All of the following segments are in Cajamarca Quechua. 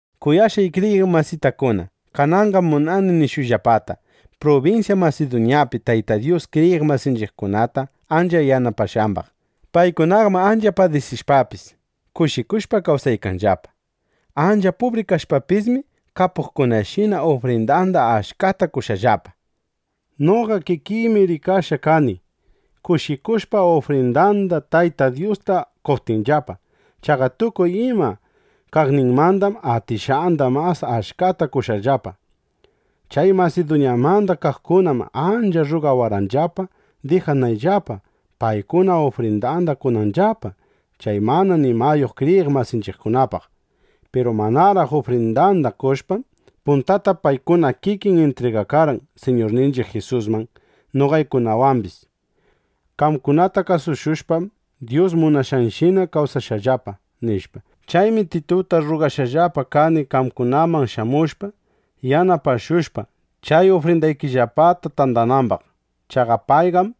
Kuyashqay kriyiq masitakuna, kananqam munani nishuyllapata prubinsya Masiduñapi Tayta Dyus kriyiq masinchiqkunata ancha yanapashqambaq. Paykunaqam ancha padisishpapis, kushikushpa kawsaykanllapa. Ancha pubri kashpapismi, kapuqkunashina ufrindanda achkata qoshqallapa. Noqa kikiymi rikashqa kani, kushikushpa ufrindanda Tayta Dyusta qoptinllapa. Chaqa tukuy ima kaqninmandam atishqanda mas achkata qoshqallapa. Chay Masiduñamanda kaqkunam ancha rrugawarqanllapa, dijanayllapa, paykuna ufrindanda qonanllapa chay mana nimayuq kriyiq masinchiqkunapaq. Piru manaraq ufrindanda qoshpam, puntata paykuna kikin intrigakarqan Siñurninchiq Jisusman, noqaykunamambis: “Qamkunata kasushushpam, Dyus munashqanshina kawsashaqllapa”, nishpa. Chaymi Tituta rrugashqallapa kani, qamkunaman shamushpa, yanapashushpa, chay ufrindaykillapata tandanambaq. Chaqa payqam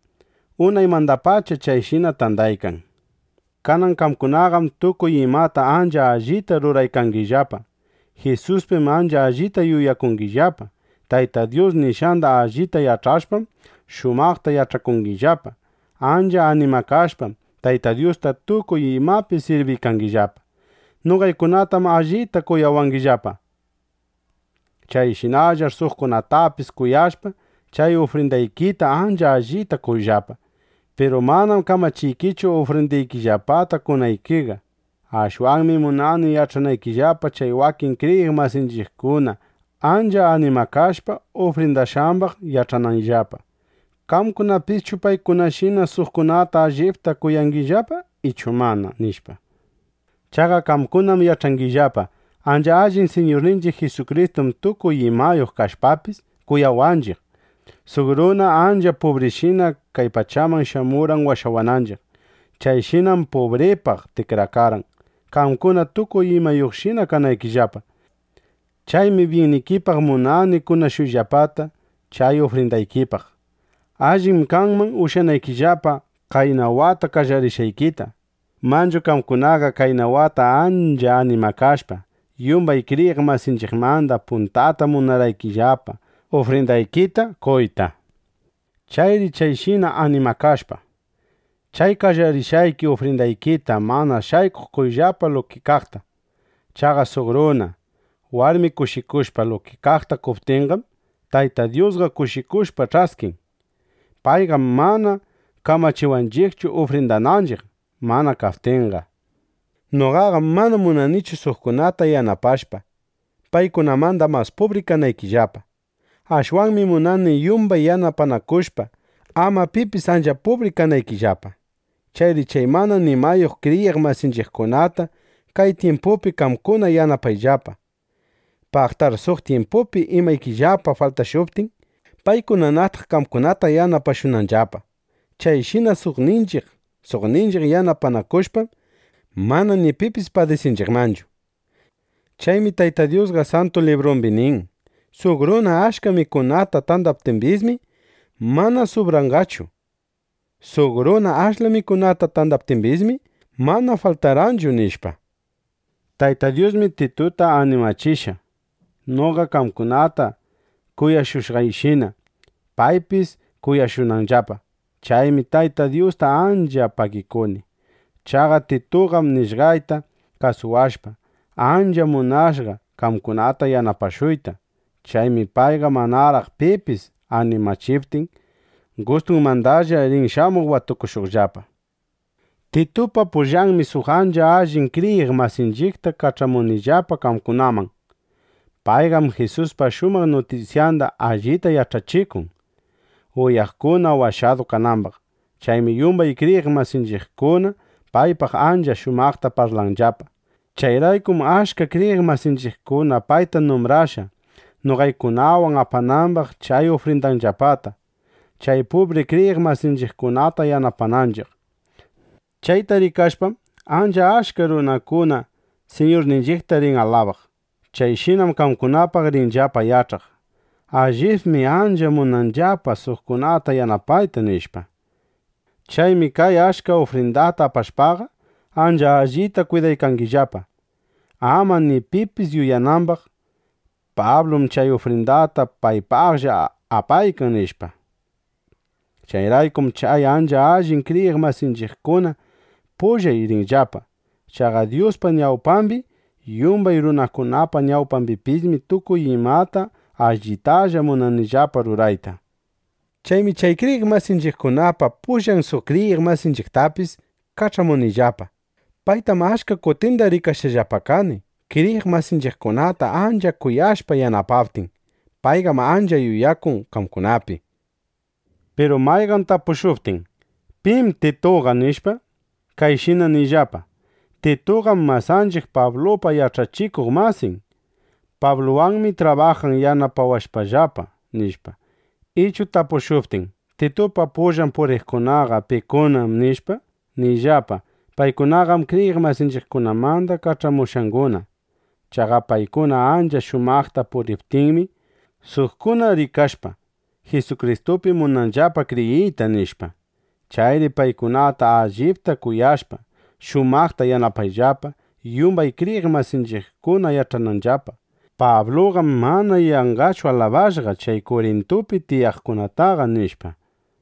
unaymandapacha chayshina tandaykan. Kanan qamkunaqam tukuy imata ancha allita ruraykangillapa. Jisuspim ancha allita yuyakuykangillapa. Tayta Dyus nishqanda allita yach'ashpam, shumaqta yach'achikungillapa. Ancha animakashpam, Tayta Dyusta tukuy imapi sirbiykangillapa. Noqaykunatam allita kuyawangillapa. Chayshinallar suqkunatapis kuyashpa, chay ufrindaykita ancha allita qoyllapa. Piru manam kamachiykichu, ufrindaykillapata qonaykiqa. Ashwanmi munani yach'anaykillapa chay wakin kriyiq masinchiqkuna ancha animakashpa ufrindashqambaq, yach'anayllapa: ¿Qamkunapischu paykunashina suqkunata allipta kuyangillapa ichu mana? nishpa. Chaqa qamkunam yach'angillapa: Ancha allin Siñurninchiq Jisukristum tukuy imayuq kashpapis, kuyawaqninchiq, suq runa ancha pubrishina kay pachaman shamurqan washawananchiq. Chayshinam pubripaq tikrakarqan, qamkuna tukuy imayuqshina kanaykillapa. Chaymi byinnikipaq munani kunashuyllapata chay ufrindaykipaq. Allim kanman ushyanaykillapa qayna wata qallarishqaykita. Manchu qamkunaqa qayna wata ancha animakashpa, yumbay kriyiq masinchiqmanda puntata munarqaykillapa ufrindaykita qoyta. Chayri chayshina animakashpa, chay qallarishqayki ufrindaykita mana shaykuq qoyllapa luki kaqta. Chaqa suq runa, warmi kushikushpa luki kaqta qoptinqam, Tayta Dyusqa kushikushpa ch'askin. Payqam mana kamachiwanchiqchu ufrindananchiq, mana kaptinqa. Noqaqam mana munanichu suqkunata yanapashpa, paykunamanda mas pubri kanaykillapa. Ashwanmi munani yumbay yanapanakushpa, ama pipis ancha pubri kananchiqllapa. Chayri chay mana nimayuq kriyiq masinchiqkunata kay tyimpupi qamkuna yanapayllapa. Paqtar suq tyimpupi imaykillapa faltashuptin, paykunanataq qamkunata yanapashunqallapa. Chayshina suqninchiq suqninchiq yanapanakushpam, mana ni pipis padisinchiqmanchu. Chaymi Tayta Dyusqa Santu Librumbi nin: “Suq runa achka mikunata tandaptimbismi, mana subrarqanchu. Suq runa ashla mikunata tandaptimbismi, mana faltarqanchu”, nishpa. Tayta Dyusmi Tituta animachishqa, noqa qamkunata kuyashushqayshina, paypis kuyashunanllapa. Chaymi Tayta Dyusta ancha pagikuni. Chaqa Tituqam nishqayta kasuwashpa, ancha munashqa qamkunata yanapashuyta. Chaymi payqa manaraq pipis animachiptin, gustunmandalla rin shamuq watukushuqllapa. Titupa pullanmi suq ancha allin kriyiq masinchiqta kach'amunillapa qamkunaman. Payqam Jisuspa shumaq nutisyanda allita yach'achikun, uyaqkuna washadu kanambaq. Chaymi yumbay kriyiq masinchiqkuna paypaq ancha shumaqta parlanllapa. Chayraykum achka kriyiq masinchiqkuna payta numbrashqa, noqaykunawan apanambaq chay ufrindanllapata, chay pubri kriyiq masinchiqkunata yanapananchiq. Chayta rikashpam, ancha achka runakuna Siñurninchiqta rin alabaq. Chayshinam qamkunapaq rinllapa yach'aq: Allibmi ancha munanllapa suqkunata yanapayta, nishpa. Chaymi kay achka ufrindata apashpaqa, ancha allita kwidaykanillapa, ama ni pipis yuyanambaq: Pablum chay ufrindata paypaqlla apaykan, nishpa. (Chayraykum chay ancha allin kriyiq masinchiqkuna pullay rinqallapa.) Chaqa Dyuspa ñawpambi, yumbay runakunapa ñawpambipismi tukuy imata allitalla munanillapa rurayta. Chaymi chay kriyiq masinchiqkunapa pullan suq kriyiq masinchiqtapis kach'amunillapa. Paytam achka kutinda rikashqallapa kani, kriyiq masinchiqkunata ancha kuyashpa yanapaptin. Payqam ancha yuyakun qamkunapi. Piru mayqan tapushuptin: “¿Pim Tituqa?” nishpa, kayshina niyllapa: “Tituqam masanchiq Pablupa yach'achikuq masin. Pabluwanmi trabajan yanapawashpallapa”, nishpa. Ichu tapushuptin: “Titupa pullan puriqkunaqa ¿pikunam?” nishpa, niyllapa: “Paykunaqam kriyiq masinchiqkunamanda kach'amushqanguna. Chaqa paykuna ancha shumaqta puriptinmi, suqkuna rikashpa, Jisukristupi munanllapa kriyiyta”, nishpa. Chayri paykunata allipta kuyashpa, shumaqta yanapayllapa, yumbay kriyiq masinchiqkuna yach'ananllapa: Pabluqam mana yanqachu alabashqa chay Kurintupi tiyaqkunataqa, nishpa.